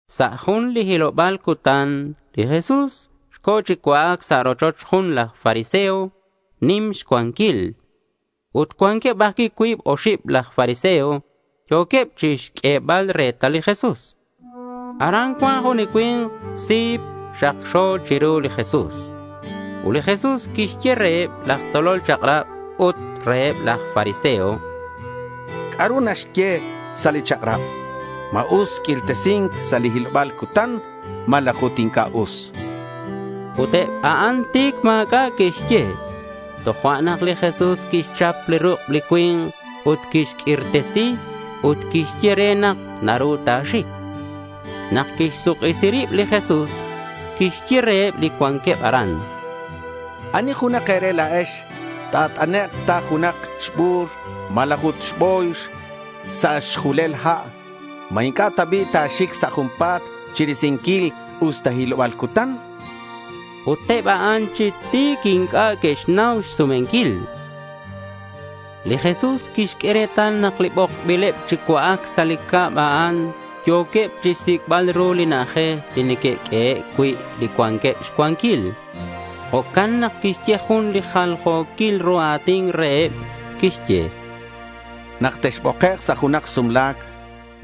Sa' jun li hiloba̱l cutan li Jesús co̱ chi cua'ac sa' rochoch jun laj fariseo nim xcuanquil. Ut cuanqueb ajcui' cuib oxib laj fariseo yo̱queb chixq'uebal retal li Jesús. Aran cuan jun li cui̱nk sip xakxo chiru li Jesús. Ut li Jesús quixye reheb laj tzolol chak'rab ut reheb laj fariseo: —¿C'a'ru naxye sa' li chak'rab? ¿Ma us q'uirtesi̱nc sa' li hiloba̱l cutan? ¿Malaj ut inc'a' us? chan reheb. Ut eb a'an ti̱c ma̱c'a' que'xye. Tojo'nak li Jesús quixchap li ruk' li cui̱nk ut quixq'uirtesi ut quixye re nak naru ta̱xic. Nak quixsuk'isi rib li Jesús, quixye reheb li cuanqueb aran: —¿Ani junak e̱re la̱ex ta̱t'anek' ta junak xbu̱r malaj ut xbo̱yx sa' xjulel ha', ma inc'a' ta bi' ta̱xic sa' junpa̱t chirisinquil usta hiloba̱l cutan? chan reheb. Ut eb a'an chi ti̱c inc'a' que'xnau xsumenquil. Li Jesús quixq'ue retal nak li bokbileb chi cua'ac sa' li cab a'an yo̱queb chixsic'bal ru li na'ajej li neque'q'uehe' cui' li cuanqueb xcuanquil. Jo'can nak quixye jun li jaljo̱quil ru a̱tin reheb. Quixye: —Nak texbokek' sa' junak sumla̱c,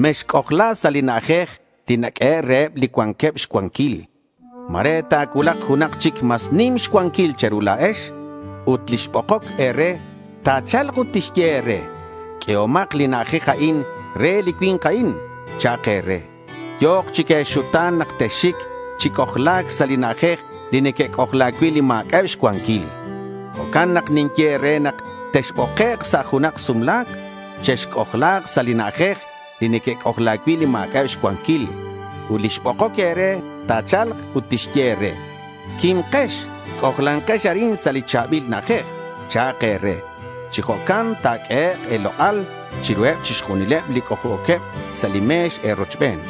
mexc'ojla sa' li na'ajej li naq'uehe' reheb li cuanqueb xcuanquil. Ma̱re ta̱cuulak junak chic mas nim xcuanquil che̱ru la̱ex. Ut li xbokoc e̱re ta̱cha̱lk ut tixye e̱re, “Q'uehomak li na'ajej a'in re li cui̱nk a'in”, cha'ak e̱re. Yo̱k chic e̱xuta̱n nak texxic chi c'ojla̱c sa' li na'ajej li neque'c'ojla cui' li ma̱c'a'eb xcuanquil. Jo'can nak ninye e̱re nak texbokek' sa' junak sumla̱c, chexc'ojla̱k sa' li na'ajej li neque'c'ojla cui' li ma̱c'a'eb xcuanquil. Ut li xbokoc e̱re, ta̱cha̱lk ut tixye e̱re, “Quimkex, c'ojlankex arin sa' li cha̱bil na'ajej”, cha'ak e̱re. Chi jo'can ta̱q'uehek' e̱lok'al chiruheb chixjunileb li c'ojc'o̱queb sa' li me̱x e̱rochben.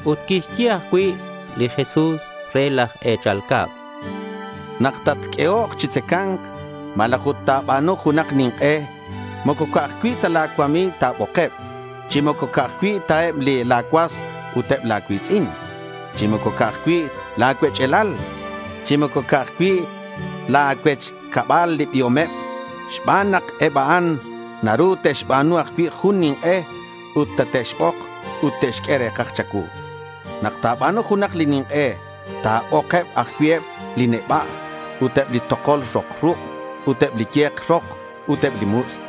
Ut quixye ajcui' li Jesús re laj e̱chal cab: —Nak tatq'uehok chi tzaca̱nc, malaj ut ta̱ba̱nu junak nink'e, moco ca'aj cui' ta la̱ cuami̱g ta̱bokeb, chi moco ca'aj cui' eb la̱ cuas ut eb la̱ cui̱tz'in, chi moco ca'aj cui' la̱ cuech'alal, chi moco ca'aj cui' la̱ cuech cabal li biomeb, xban nak eb a'an naru te'xba̱nu ajcui' jun nink'e ut tate'xbok ut te'xq'ue re̱kaj cha̱cuu. Nak ta̱ba̱nu junak li nink'e, ta̱bok ajcui' eb li neba' ut eb li tokol rok ruk', ut eb li ye̱k rok ut eb li mutz',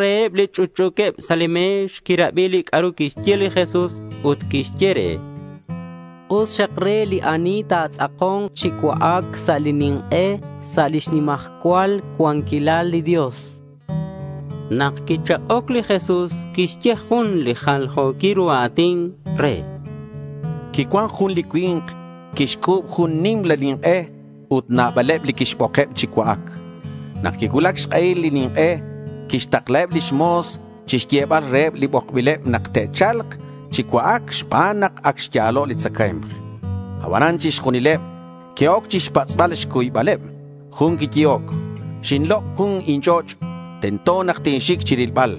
Jun reheb li chunchu̱queb sa' li me̱x quirabi li c'a'ru quixye li Jesús ut quixye re: —Us xak re li ani ta̱tz'ako̱nk chi cua'ac sa' li nink'e sa' lix nimajcual cuanquilal li Dios, chan. Nak quichak'oc, li Jesús quixye jun li jaljo̱quil ru a̱tin re: Quicuan jun li cui̱nk quixc'u̱b jun nimla nink'e ut nabaleb li quixbokeb chi cua'ac. Nak quicuulac xk'ehil li nink'e, quixtakla lix mo̱s chixyebal reheb li bokbileb nak te'cha̱lk chi cua'ac xban nak ac xya̱lo' li tzacae̱mk. Abanan chixjunileb que'oc xpatz'bal xcuybaleb. Jun quiyehoc: —Xinlok' jun inch'och'. Tento nak tinxic chirilbal.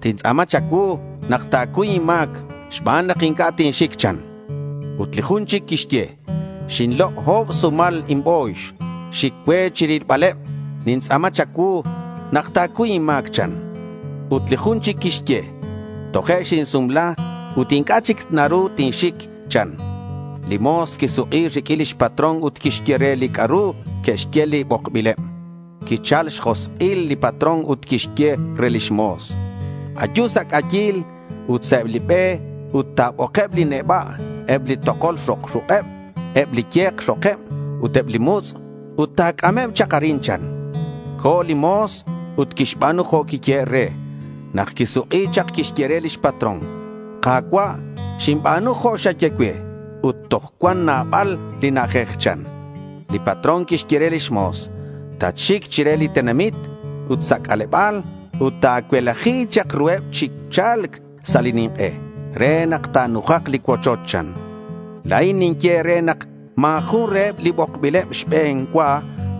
Tintz'a̱ma cha̱cuu nak ta̱cuy inma̱c xban nak inc'a' tinxic, chan. Ut li jun chic quixye: —Xinlok' o̱b sumal inbo̱yx. Xic cue chirilbaleb. Nintz'a̱ma cha̱cuu nak ta̱cuy inma̱c, chan. Ut li jun chic quixye: —Toje' xinsumla ut inc'a' chic naru tinxic, chan. Li mo̱s quisuk'i riq'uin lix patrón ut quixye re li c'a'ru que'xye li bokbileb. Quichal xjosk'il li patrón ut quixye re lix mo̱s: —Ayu sa' c'ayil ut sa' eb li be ut ta̱bokeb li neba', eb li tokol rok ruk'eb, eb li ye̱k rokeb ut eb li mutz' ut ta̱c'ameb chak arin, chan. Co̱ li mo̱s ut quixba̱nu jo' quiyehe' re. Nak quisuk'i chak quixye re lix patrón: —Ka̱cua', xinba̱nu jo' xaye cue ut toj cuan nabal li na'ajej, chan. Li patrón quixye re lix mo̱s: —Tatxic chire li tenamit ut sa' c'aleba̱l ut ta̱cuelaji chak ruheb chi cha̱lc sa' li nink'e re nak ta̱nujak li cuochoch, chan. La̱in ninye e̱re nak ma̱ jun reheb li bokbileb xbe̱n cua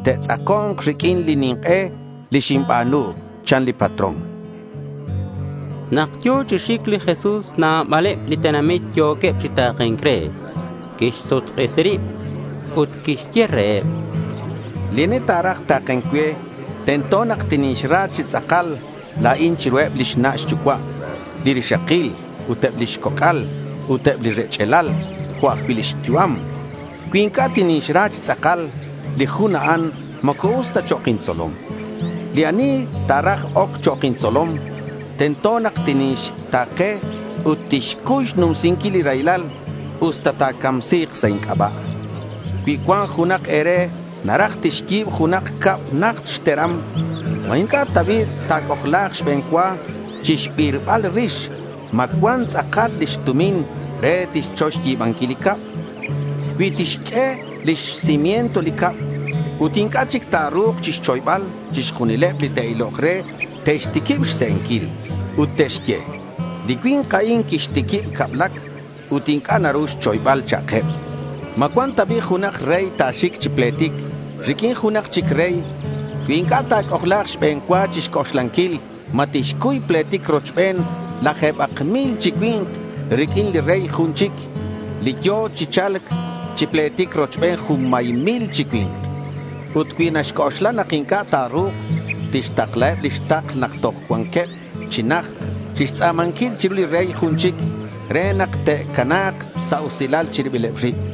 te'tz'ako̱nk riq'uin li nink'e li xinba̱nu, chan li patrón. Nak yo̱ chi xic li Jesús nabaleb li tenamit yo̱queb chi ta̱ke̱nc re. Quixsuk'isi rib li Jesús ut quixye reheb: —Li ani ta̱raj ta̱ke̱nc cue, tento nak tinixra chi tz'akal la̱in chiruheb lix na' xyucua', li rixakil ut eb lix coc'al, ut eb li rech'alal jo' ajcui' lix yu'am. Cui inc'a' tinixra chi tz'akal, li jun a'an moco us ta chok' intzolom. Li ani ta̱raj oc chok' intzolom, tento nak tinixta̱ke ut tixcuy xnumsinquil li raylal usta ta̱camsi̱k sa' inc'aba'. Cui cuan junak e̱re naraj tixyi̱b junak cab najt xteram, ¿ma inc'a' ta bi' ta̱c'ojla̱k xbe̱n cua chixbirbal rix ma cuan tz'akal lix tumin re tixchoy xyi̱banquil li cab? Cui tixq'ue lix cimiento li cab ut inc'a' chic ta̱ru̱k xchoybal, chixjunileb li te'ilok re te'xtiquib xse'enquil. Ut te'xye, —Li cui̱nk a'in quixtiquib cablac ut inc'a' naru xchoybal, cha'keb. ¿Ma cuan ta bi' junak rey ta̱xic chi pletic riq'uin junak chic rey cui inc'a' ta̱c'ojla̱k xbe̱n cua chixc'oxlanquil ma tixcuy pletic rochbeneb laje̱bak mil chi cui̱nk riq'uin li rey jun chic, li yo̱ chi cha̱lc chi pletic rochbeneb junmay mil chi cui̱nk? Ut cui naxc'oxla nak inc'a' ta̱ru̱k, tixtaklaheb lix takl nak toj cua̱nkeb chi najt chixtz'a̱manquil chiru li rey jun chic re nak te'cana̱k sa' usilal chi ribileb rib.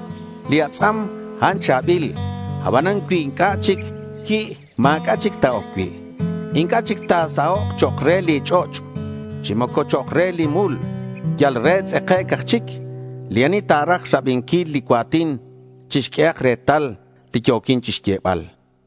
Li atz'am, a'an cha̱bil. Abanan cui inc'a' chic qui', ma̱c'a' chic ta̱oc cui'. Inc'a' chic ta̱usa̱k chok' re li ch'och', chi moco chok' re li mul. Yal re tz'ekec' aj chic. Li ani ta̱raj rabinquil li cua̱tin, chixq'uehak retal li yo̱quin chixyebal.